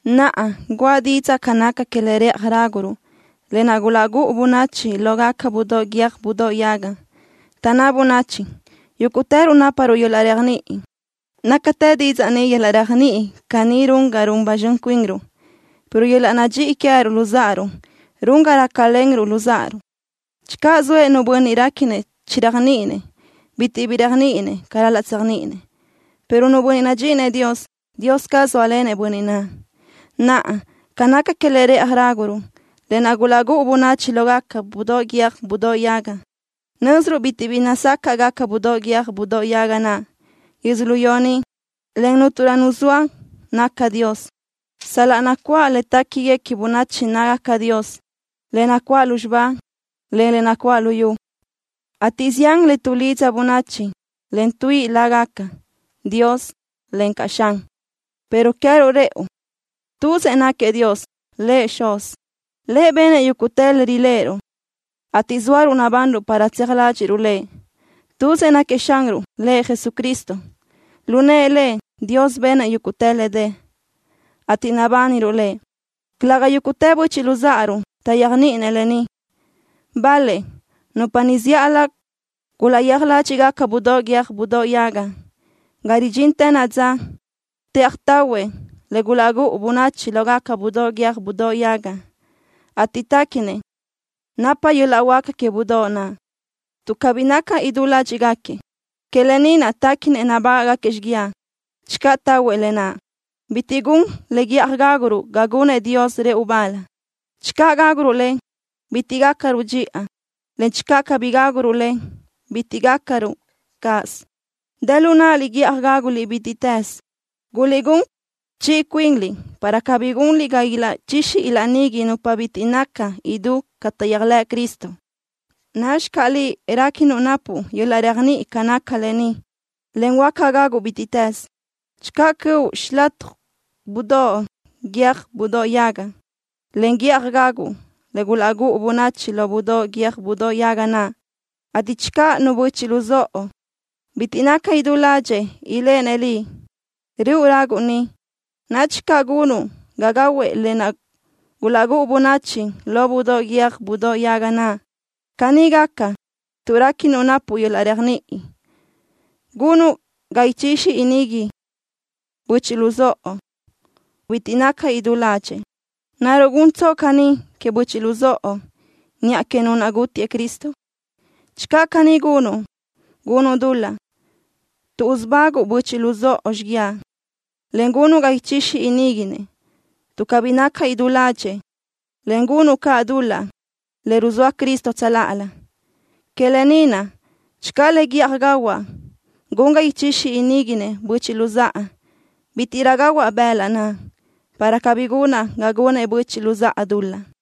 Naʼa, guʼa didzaʼ ca naca que le rëʼaj ráguruʼ, lë naʼ gulaʼgúʼu bönachi lógaca budóʼ guiö́j budóʼ yaga. Taʼnná bönachi: “Yúguʼtëruʼ náparuʼ yöl-laʼ réajniʼi.” ¡Nácatë didzaʼ ni! Yöl-laʼ réajniʼi caní run ga run ba zxön cuinruʼ, pero yöl-laʼ nadxíʼi queë́ruʼ luzáʼaruʼ run ga rácalenruʼ luzáʼaruʼ. Channö zoëʼ nu bönniʼ réquinëʼ chiréajniʼinëʼ, bitiʼ bi réajniʼininëʼ ca ral-laʼ tséajniʼinëʼ, pero nu bönniʼ nadxíʼinëʼ Dios, Dios caz zóalenëʼ bönniʼ naʼ. Naʼa, ca naca que le rëʼaj ráguruʼ, lë naʼ gulaʼgúʼu bönachi lógaca budóʼ guiö́j budóʼ yaga, nö́ziruʼ bitiʼ bi nazácaʼgaca budóʼ guiö́j budóʼ yaga naʼ yödzölió ni, en cúnturö nu zoa naca Dios. Sal-laʼ nacuáʼ le téquiguequi bönachi nácagaca dios, le nacuáʼ lúzxiba, en le nacuáʼ luyú, ateʼ zián le tuʼlidza bönachi, en tuíʼi lágaca: dios, encaʼ: xan, pero queë́ruʼ rëʼu: Tuzëʼ náquiëʼ Dios, Lëʼ Xuz. Lëʼ benëʼ yúguʼtë le riléʼeruʼ, ateʼ zóaruʼ nabanruʼ para tseaj ládxiʼruʼ Lëʼ. Tuzëʼ náquiëʼ Xanruʼ, Lëʼ Jesucristo. Lu nëʼë Lëʼ, Dios benëʼ yúguʼtë le dë, ateʼ nabániruʼ Lëʼ. Calëga yúguʼtë böchiʼ luzáʼaruʼ taʼyéajniʼinëʼ lë ni. Bal-lëʼ, nupa niʼ zíʼalö gulaʼyéaj ládxiʼgaca budóʼ guiö́j budóʼ yaga, ga ridxintë naʼa dza tëʼaj tahuëʼ le gulaʼgúʼu bönachi lógaca budóʼ guiö́j budóʼ yaga, ateʼ téquinëʼ napa yöl-laʼ huáca que budóʼ naʼ. Tuʼ cabí naca idú ládxiʼgaquiëʼ, que lë ni naʼ téquinëʼ nabágaʼgaquiëʼ xíguiaʼ channö tahuëʼ lë naʼ. Bitiʼ gun le guíʼaj gáguruʼ ga gunëʼ Dios rëʼu bal. Channö gáguruʼ le, bitiʼ gácaröruʼ dxiʼa, en channö cabí gáguruʼ le, bitiʼ gácaröruʼ cáʼasö. Dë lu náʼaliʼ guíʼaj gáguliʼ bítiʼtës. Guliʼgún chiʼi cuinliʼ para cabí gunliʼ ga ilaʼchixi ilaʼnigui nupa bitiʼ naca idú ca taʼyéajlëʼ Cristo. Nadxi caʼ liʼ réquinuʼ napuʼ yöl-laʼ réajniʼi ca naca lë ni, en huáca gaguʼ bítiʼtës. Channö cöʼu xilataj budóʼ guiö́j budóʼ yaga, en guíʼaj gaguʼ le gulaʼgúʼu bönachi lo budóʼ guiö́j budóʼ yaga naʼ, ateʼ channö nu böchiʼ luzóʼo bitiʼ naca idú ládxëʼë iléʼenëʼ liʼ, röʼu raguʼ niʼ, nadxi caʼ gunuʼ ga gahuëʼ lë naʼ gulaʼgúʼu bönachi lo budóʼ guiö́j budóʼ yaga naʼ. Caní gaca, tuʼ réquinuʼ napuʼ yöl-laʼ réajniʼi, gunuʼ ga ichixi iníguinëʼ böchiʼ luzóʼo bitiʼ naca idú ládxëʼë. ¿Naruʼ guntsoʼ caní queëʼ böchiʼ luzóʼo, niʼa que nu naʼ gútiëʼ Cristo? Channö caní gunuʼ, gunuʼ dul-laʼ tuʼ usubáguʼu böchiʼ luzóʼo xíguiaʼ, en gunuʼ ga ichixi iníguinëʼ tuʼ cabí naca idú ládxëʼë, en gunuʼ caʼ dul-laʼ le ruzóa Cristo tsöláʼalö. Que lë ni naʼ, channö le guíʼaj gahuaʼ gun ga ichixi iníguinëʼ böchiʼ luzáʼa, bítiʼrö gahuaʼ bëlaʼ naʼ, para cabí gunaʼ ga gunëʼ böchiʼ luzáʼa dul-laʼ.